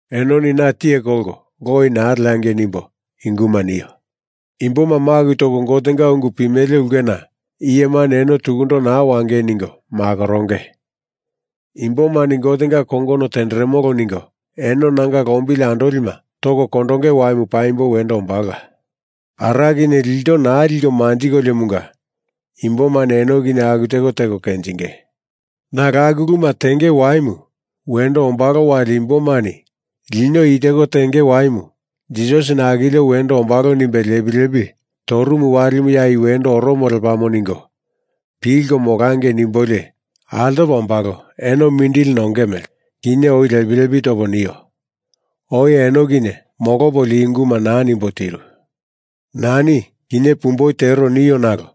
“Enoni na tiye kolko loi naa leangei nimbo i unguma nio. Imboma maku toko Gotenga ungu pimele ulkena iyemani eno tukundo naa wangei ningo makoronge. Imbomani Gotenga kongono tenderemolo ningo eno nanga lombili andolima toko kondonge waimu paimbo wendo ombalola. Ara kinye ilto naa liko manjikoliomunga imbomani eno kinye aku teko teko kenjinge. Nalo aku uluma tenge waimu wendo ombalo wali imbomani lino i teko tenge waimu Jisasini akilio wendo ombalo nimbe lepi lepi torumu walimu ya i wendo oromo lepamo ningo pilko molangei nimbolio altopa ombalo eno mindili nonge mele, kinye oi lepi lepi topo nio. Oi eno kinye molopolio i unguma naa nimbo tiru.” “Nani kinye pumboi tero nio nalo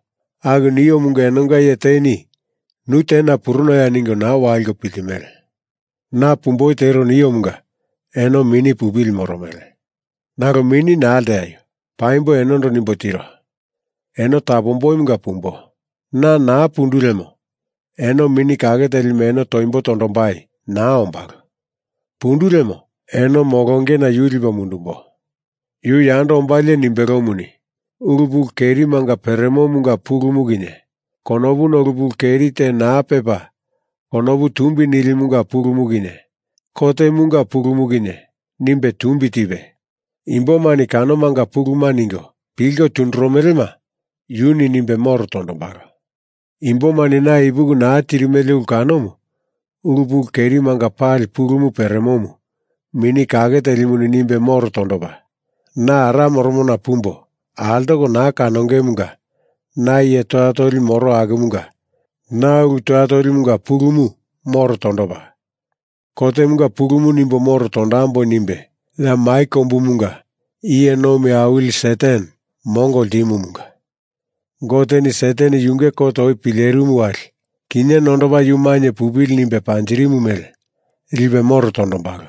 aku niomunga enonga iye teni nu tena purunoya ningo naa waliko piltimele. Na pumboi tero niomunga eno mini pupili moromele. Nalo mini naa lteaio! Paimbo enondo nimbo tiro. Eno tapomboimunga pumbo. Na naa pundu lemo eno Mini Kake Telimu eno toimbo tondombai naa ombalo. Pundu lemo eno molongena yu lipo mundumbo. Yu yando ombalie nimbelomuni, ulu pulu kerimanga peremomunga pulumu kinye konopuna ulu pulu keri te naa pepa konopu tumbi nilimunga pulumu kinye kotemunga pulumu kinye nimbe tumbi tipe, imbomani kanomanga puluma ningo pilko tunduromelema yuni nimbe moro tondombalo. Imbomani na ipuki naa tirimele ulu kanomu ulu pulu kerimanga pali pulumu peremomu Mini Kake Telimuni nimbe moro tondopa, na Ara moromona pumbo altoko naa kanongemunga na iye toya toli moro akumunga na ulu toya tolimunga pulumu moro tondopa, kotemunga pulumu nimbo moro tondamboi nimbe ya mai kombumunga iye nomi awili Satan mongo ltimumunga Goteni Satan yunge kot oi pilerimu wali kinye nondopa yu mainye pupili nimbe panjirimu mele lipe moro tondombalo.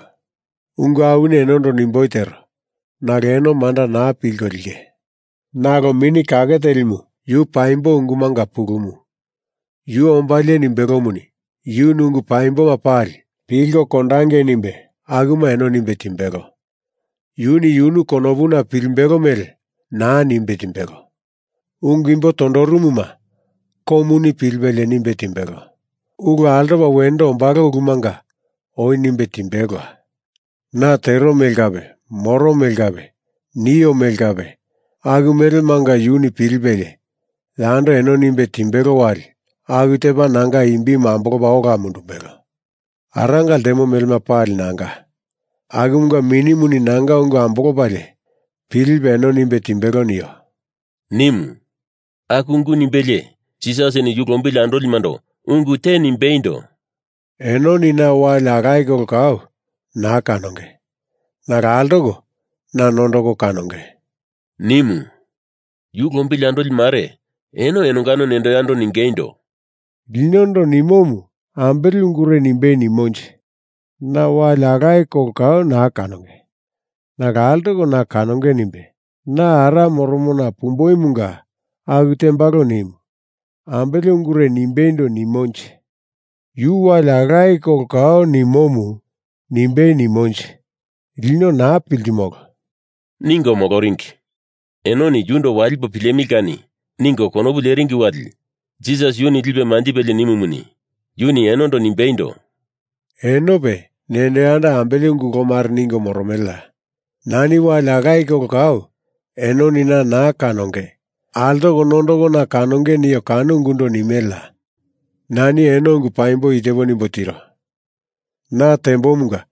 Ungu awini enondo nimboi tero, nalo eno manda naa pilko linge. Nalo Mini Kake Telimu, yu paimbo ungumanga pulumu, yu ombalie nimbelomuni, yuni ungu paimboma pali pilko kondangei nimbe akuma eno nimbe timbelo. Yuni yunu konopuna pilimbelo mele naa nimbe timbelo. Ungu imbo tondoromuma komuni pilipelie nimbe timbelo. Ulu altopa wendo ombalo ulumanga oi nimbe timbelola. Na tero mele kape moro mele kape nio mele kape aku melemanga yuni pilipelie yando eno nimbe timbelo wali aku tepa nanga imbimu ambolopa ola mundumbelo. Aranga ltemo melema pali nanga. Akumunga Minimuni nanga ungu ambolopalie pilipe eno nimbe timbelo nio,” nimu. Aku ungu nimbelie Jisasini yu lombili andolimando ungu te nimbeindo, “Enoni na wali alaye kolo kau naa kanonge. Nalo altoko na nondoko kanonge,” nimu. Yu lombili andoli mare eno enongano nendo yando ningeindo, “Linondo nimomu ambele ungure nimbei nimonje? Na wali alaye kolo kau naa kanonge, nalo altoko na kanonge nimbe, na Ara moromona pumboimunga aku tembalo nimu, ambele ungure nimbeindo nimonje? Yu wali alaye kolo kau nimomu nimbei nimonje? Lino naa piltimolo,” ningo moloringi. Enoni yundo walipo pilemili kani, ningo konopu leringi wali Jisas yuni lipe manjipelie nimumuni, yuni enondo nimbeindo, “Enope nendo yando ambele ungu kolo mare ningo moromeleya? Nani wali alaye kolo kau enoni na naa kanonge, altoko nondoko na kanonge nio kano ungundo nimeleya? Nani eno ungu paimbo i tepo nimbo tiro. Na tembomunga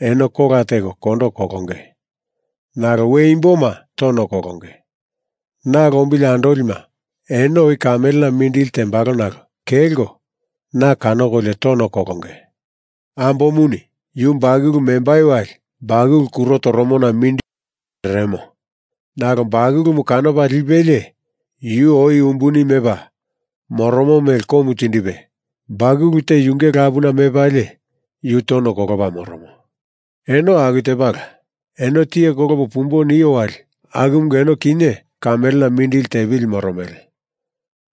eno kola teko kondo kolonge. Nalo we imboma tono kolonge. Na lombili andolima eno oi kamelena mindili tembalo nalo kelko na kanokolio tono kolonge. Ambomuni yu bakulu membai wali bakulu kuro toromona mindili nomba pereremo. Nalo bakulumu kanopa lipelie yu oi umbuni mepa moromo mele komu tindipe bakulu te yunge lapuna mepalie yu tono kolopa moromo. Eno aku tepala. Eno tiye kolopo pumbo nio wali akumunga eno kinye kamelena mindili tepili moromele.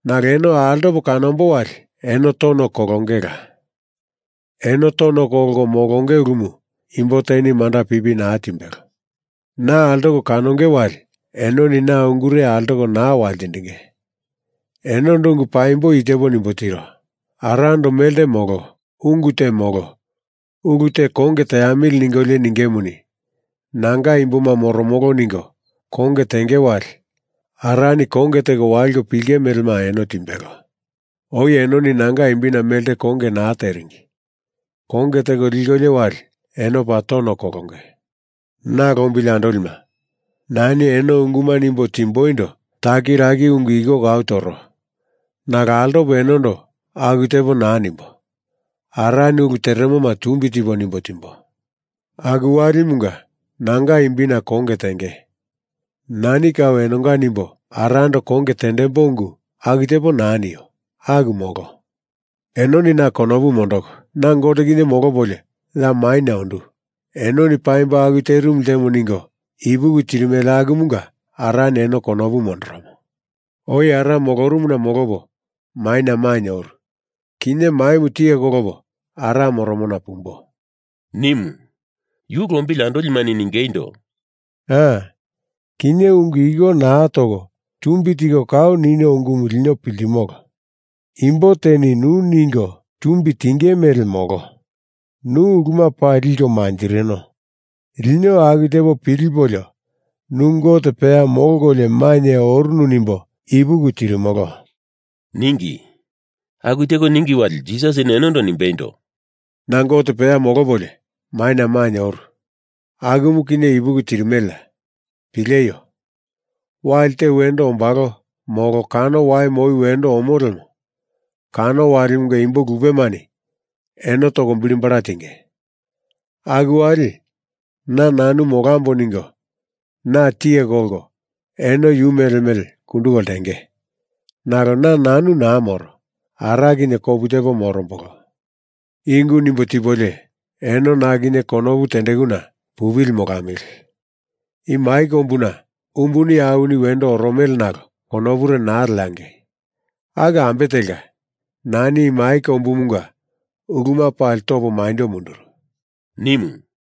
Nalo eno altopo kanombo wali eno tono kolongela. Eno tono kolko molonge ulumu imbo teni manda pipi naa timbelo. Na altoko kanonge wali enoni na ungure altoko naa waltindinge. Enondo ungu paimbo i tepo nimbo tiro. Arando melte molo ungu te molo ulu te konge teamili ningolio ningemuni, nanga imboma moromolo ningo konge tenge wali Arani konge teko waliko pilinge melema eno timbelo. Oi enoni nanga imbina melte konge naa teringi. Konge teko likolio wali eno paa tono kolonge.” “Na lombili andolima, nani eno unguma nimbo timboindo takiraki ungu iko kau toro. Nalo altopo enondo aku tepo naa nimbo. Arani ulu teremoma tumbi tipo nimbo timbo. Aku walimunga nanga imbina konge tenge. Nani kau enonga nimbo Arando konge tendembo ungu aku tepo naa nio. Aku molo. Enoni na konopu mondoko, na Gote kinye molopolio ya maina ondu enoni paimbo aku terimu ltemo ningo ipuki tirimele akumunga Arani eno konopu mondoromo. Oi Ara molorumuna molopo maina mainye oru. Kinye maimu tiye kolopo Ara moromona pumbo,” nimu. Yu lombili andolimani ningeindo, “A, kinye ungu iko naa toko tumbi tiko kau nino ungumu lino piltimolo. Imbo teni nu ningo tumbi tingei mele molo. Nu uluma pali liko manjirino. Lino aku tepo pilipolio nu Gote peya molkolio maina orunu nimbo ipuki tirimolo,” ningi. Aku teko ningi wali Jisasini enondo nimbeindo, “Na Gote peya molopolio maina mainye oru, akumu kinye ipuki tirimeleya. Pileio! Wali te wendo ombalo, molo, kano walimu oi wendo omo lemo, kano walimunga imbo lupemani eno toko bili bala tinge. Aku wali na nanu molambo ningo na tiye kolko eno yu mele mele kunduko ltenge. Nalo na nanu naa moro, Ara kinye kopu tepo morombolo. I ungu nimbo tipolio eno na kinye konopu tendekuna pupili molamili. I mai kombuna umbuni awini wendo oromele nalo konopure naa leangei. Aku ambe telka, nani i mai kombumunga uluma pali topa maindo munduru,” nimu.